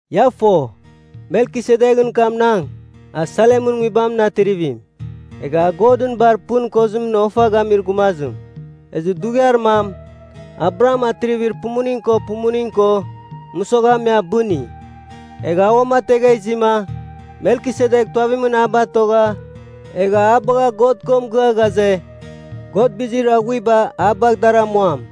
Ia fo, Melkisedeghɨn kamnang, a Salemɨn nguibamɨn atrivim, egha a Godɨn Bar Pɨn Kozimɨn ofa gamir gumazim. Ezɨ dughiar mam Abraham atrivir pumuning ko pumuning ko mɨsogha me abɨni. Egha a uamategha izima, Melkisedek tuavimɨn a batogha egha a bagha God ko mɨgɨa ghaze, God bizir aghuiba a bagh dar amuam.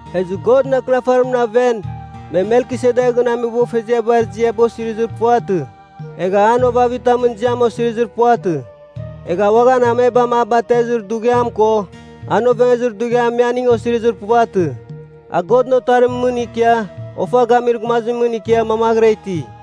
Ezɨ Godɨn Akɨnafarimɨn aven, me Melkisedeghɨn ameboghfeziabar ziaba osirizir puvatɨ, egha an ovavitamɨn ziam osirizir puvatɨ. Egha uaghan amebam a batezir dughiam ko an ovengezir dughiam me aning osirizir puvatɨ. A Godɨn Otarimɨn mɨn ikia Ofa Gamir Gumazimɨn ikia mamaghɨra iti.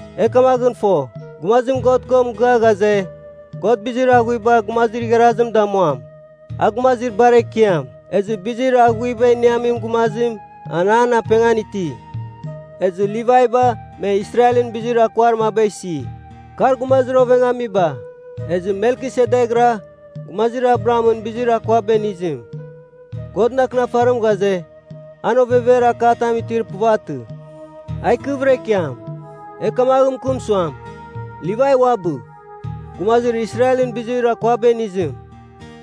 E kamaghɨn fo, gumazim God ko mɨgɨa ghaze, God bizir aghuiba gumazir igharazim damuam, a gumazir bar ekiam. Ezɨ bizir aghuiba iniamin gumazim, an an apengan iti. Ezɨ Livaiba me Israelɨn bizir akuar maba isi, kar gumazir ovengamiba. Ezɨ Melkisedekra, gumazir Abrahamɨn bizir akuaba inizim, Godɨn Akɨnafarim ghaze, an ovever akatam itir puvatɨ, a ikɨvɨra ikiam. E kamaghɨn mɨkɨm suam, Livai uabɨ, gumazir Israelɨn bizir akuaba inizim,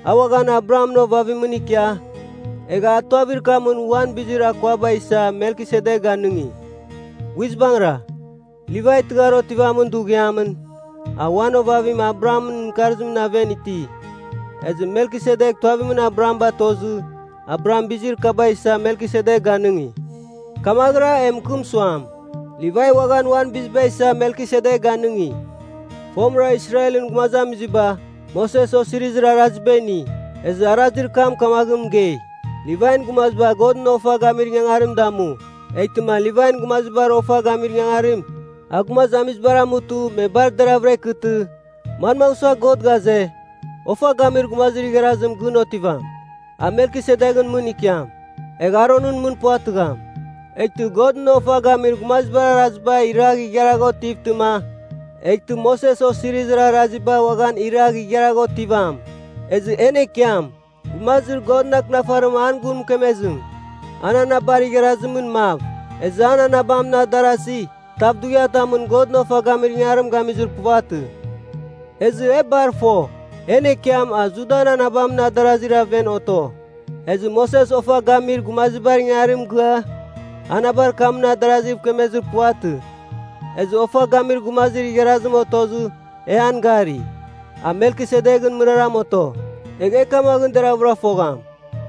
a uaghan Abrahamɨn ovavimɨn ikia, egha a tuavir kamɨn uan bizir akuaba isa Melkisedek ganɨngi. Guizbangɨra, Livai tɨghar otivamin dughiamɨn, a uan ovavim Abrahamɨn mɨkarzimɨn aven iti. Ezɨ Melkisedek tuavimɨn Abraham batozɨ Abraham bizir kaba isa Melkisedek ganɨngi. Kamaghɨra e mɨkɨm suam, Livai uaghan uan biziba isa Melkisedek ganɨngi. Fomɨra Israelɨn gumazamiziba, Moses Osirizir Araziba ini, ezɨ arazir kam kamaghɨn mɨgei, Livain gumaziba Godɨn ofa gamir ingangarim damu. Eghtɨma Livain gumazibar ofa gamir ingangarim, a gumazamizibar amutɨ me bar deraghvɨra ikɨtɨ, manmagh sua God ghaze, ofa gamir gumazir igharazim gɨn otivam? A Melkisedeghɨn mɨn ikiam. Egh Aronɨn mɨn puvatɨgham. Eghtɨ Godɨn ofa gamir gumazibar araziba iragh igharagh otivtɨma, eghtɨ Moses Osirizir Araziba uaghan iragh igharagh otivam. Ezɨ en Ekiam, gumazir Godɨn Akɨnafarim an gun mɨkemezim, a anabar igharazimɨn mav. Ezɨ an anabamɨn adarazir tav dughiatamɨn Godɨn ofa gamir ingangarim gamizir puvatɨ. Ezɨ e bar fo, en Ekiam a Judan anabamɨn adarazir aven oto. Ezɨ Moses ofa gamir gumazibar ingangarim mɨgɨa, anabar kamɨn adarazi mɨkemezir puvatɨ. Ezɨ ofa gamir gumazir igharazim otozɨ e an gari, a Melkisedeghɨn mɨraram oto. Egh e kamaghɨn deraghvɨra fogham,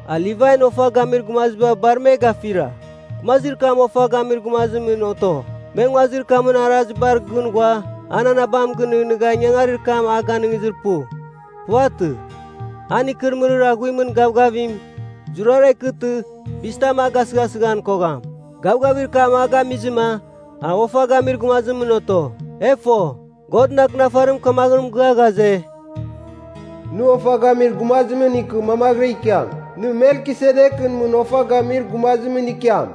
a Livain ofa gamir gumaziba bar me gafira. Gumazir kam ofa gamir gumazimɨn oto; me nguazir kamɨn arazibar gɨn ghua an anabam gɨnɨghnɨgha ingangarir kam a ganɨngizir pu. Puvatɨ. An ikɨrɨmɨrir aghuimɨn gavgavim zurara ikɨtɨ bizitam a gasɨghasɨghan kogham. Gavgavir kam a gamizɨma a ofa gamir gumazimɨn oto. E fo, Godɨn Akɨnafarim kamaghɨn mɨgɨa ghaze, “Nɨ ofa gamir gumazimɨn ikɨ mamaghɨra ikiam. Nɨ Melkisedeghɨn mɨn ofa gamir gumazimɨn ikiam.”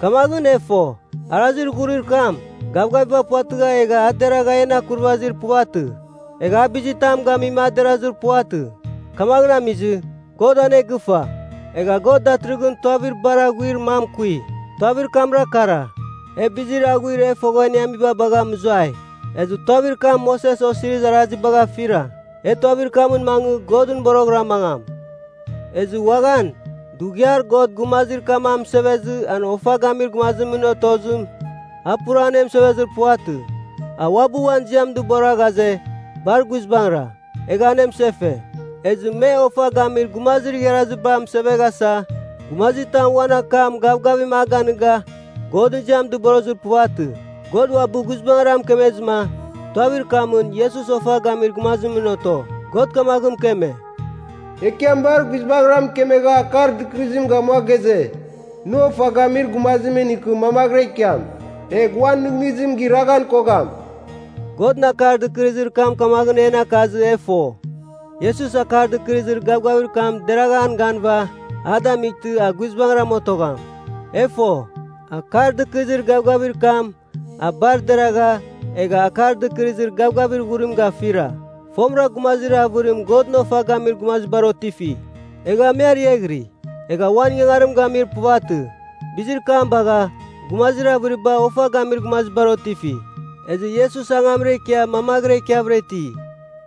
Kamaghɨn e fo, arazir ghurir kam, gavgaviba puvatɨgha egha a deragha en akurvazir puvatɨ. Egha a bizitam gamima a derazir puvatɨ. Kamaghɨn amizɨ, God anegɨfa. Egha God datɨrɨghɨn tuavir bar aghuir mam kui. Tuavir kamra kara, e bizir aghuir e fogha iniamiba bagha mɨzuai. Ezɨ tuavir kam Moses Osirizir Arazibagh afira. E tuavir kamɨn mangɨ Godɨn boroghɨra mangam. Ezɨ uaghan, dughiar God gumazir kam amɨsevezɨ an ofa gamir gumazimɨn otozim, a pura anemɨsevezir puvatɨ. A uabɨ uan ziam dɨbora ghaze, bar guizbangɨra, egha anemɨsefe. Ezɨ me ofa gamir gumazir igharaziba amɨseveghasa, gumazitam uan akam gavgavim ganɨga Godɨn ziam dɨborozir puvatɨ. God uabɨ guizbangɨra mɨkemezɨma, tuavir kamɨn Iesus ofa gamir gumazimɨn oto. God kamaghɨn mɨkeme, “Ekiam bar guizbangɨra mɨkemegha akar dɨkɨrɨzim gamua ghaze, ‘Nɨ ofa gamir gumazimɨn ikɨ mamaghɨra ikiam,’ egh uan nɨghnɨzim giraghan kogham.” Godɨn akar dɨkɨrɨzir kam kamaghɨn en akazɨ e fo, Iesus Akar Dɨkɨrɨzir Gavgavir kam deragh an ganɨva a damightɨ, a guizbangɨra otogham. E fo, Akar Dɨkɨrɨzir Gavgavir kam a bar deragha, egha Akar Dɨkɨrɨzir Gavgavir Ghurim gafira. Fomɨra, gumazir avɨrim Godɨn ofa gamir gumazibar otifi. Egha me ariaghiri, egha uan ingangarim gamir puvatɨ. Bizir kam bagha, gumazir avɨriba ofa gamir gumazibar otifi. Ezɨ Iesus angamra ikia mamaghɨra ikiavɨra iti.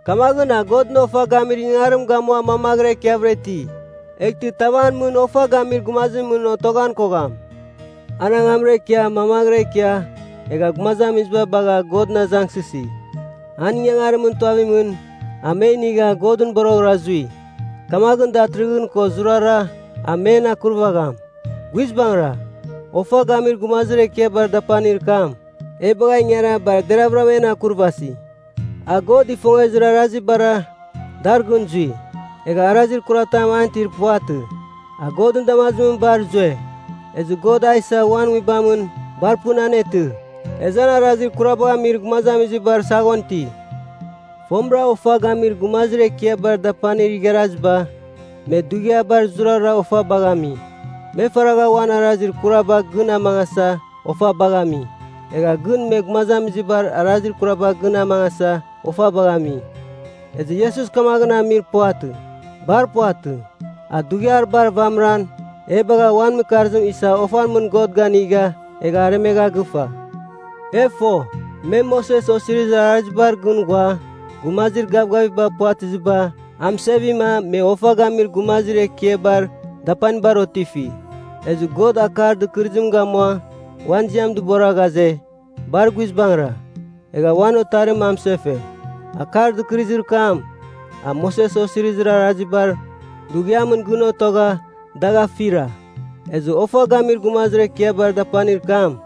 Kamaghɨn a Godɨn ofa gamir ingangarim gamua mamaghɨra ikiavɨra iti. Eghtɨ tav an mɨn ofa gamir gumazimɨn otoghan kogham. An angamra ikia mamaghɨra ikia egha gumazamiziba bagha Godɨn azangsɨsi. An ingangarimɨn tuavimɨn a me inigha Godɨn boroghɨra zui. Kamaghɨn, datɨrɨghɨn ko zurara, a men akurvagham. Guizbangɨra, Ofa Gamir Gumazir Ekiabar Dapanir kam e bagha ingara bar deravɨra en akurvasi. A God ifongezir arazibara, dar gɨn zui. Egha arazir kuratam an itir puvatɨ. A Godɨn damazimɨn bar zue. Ezɨ God a isa uan Nguibam bar pɨn anetɨ, ezɨ an arazir kurabagh amir gumazamizibar saghon iti. Fomɨra ofa gamir gumazir ekiabar dapanir igharaziba, me dughiabar zurara ofabagh ami. Me faragha uan arazir kuraba gɨn amangasa ofabagh ami. Egha gɨn me gumazamizibar arazir kuraba gɨn amangasa ofabagh ami. Ezɨ Iesus kamaghɨn amir puvatɨ. Bar puvatɨ. A dughiar bar vamɨran, e bagha uan mɨkarzim isa ofan mɨn God ganigha egha aremegha gɨfa. E fo, me Moses Osirizir Arazibar gɨn ghua, gumazir gavgaviba puvatɨziba amɨsevima me ofa gamir gumazir ekiabar dapanibar otifi. Ezɨ God akar dɨkɨrɨzim gamua uan ziam dɨbora ghaze, bar guizbangɨra, egha uan Otarim amɨsefe. Akar dɨkɨrɨzir kam, a Moses Osirizir Arazibar dughiamɨn gɨn otogha dagh afira. Ezɨ Ofa Gamir Gumazir Ekiabar Dapanir kam,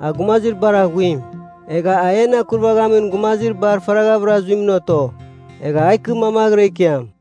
a gumazir bar aghuim. Egha a en akurvaghamin gumazir bar faraghavɨra zuimɨn oto. Egh a ikɨ mamaghɨra ikiam.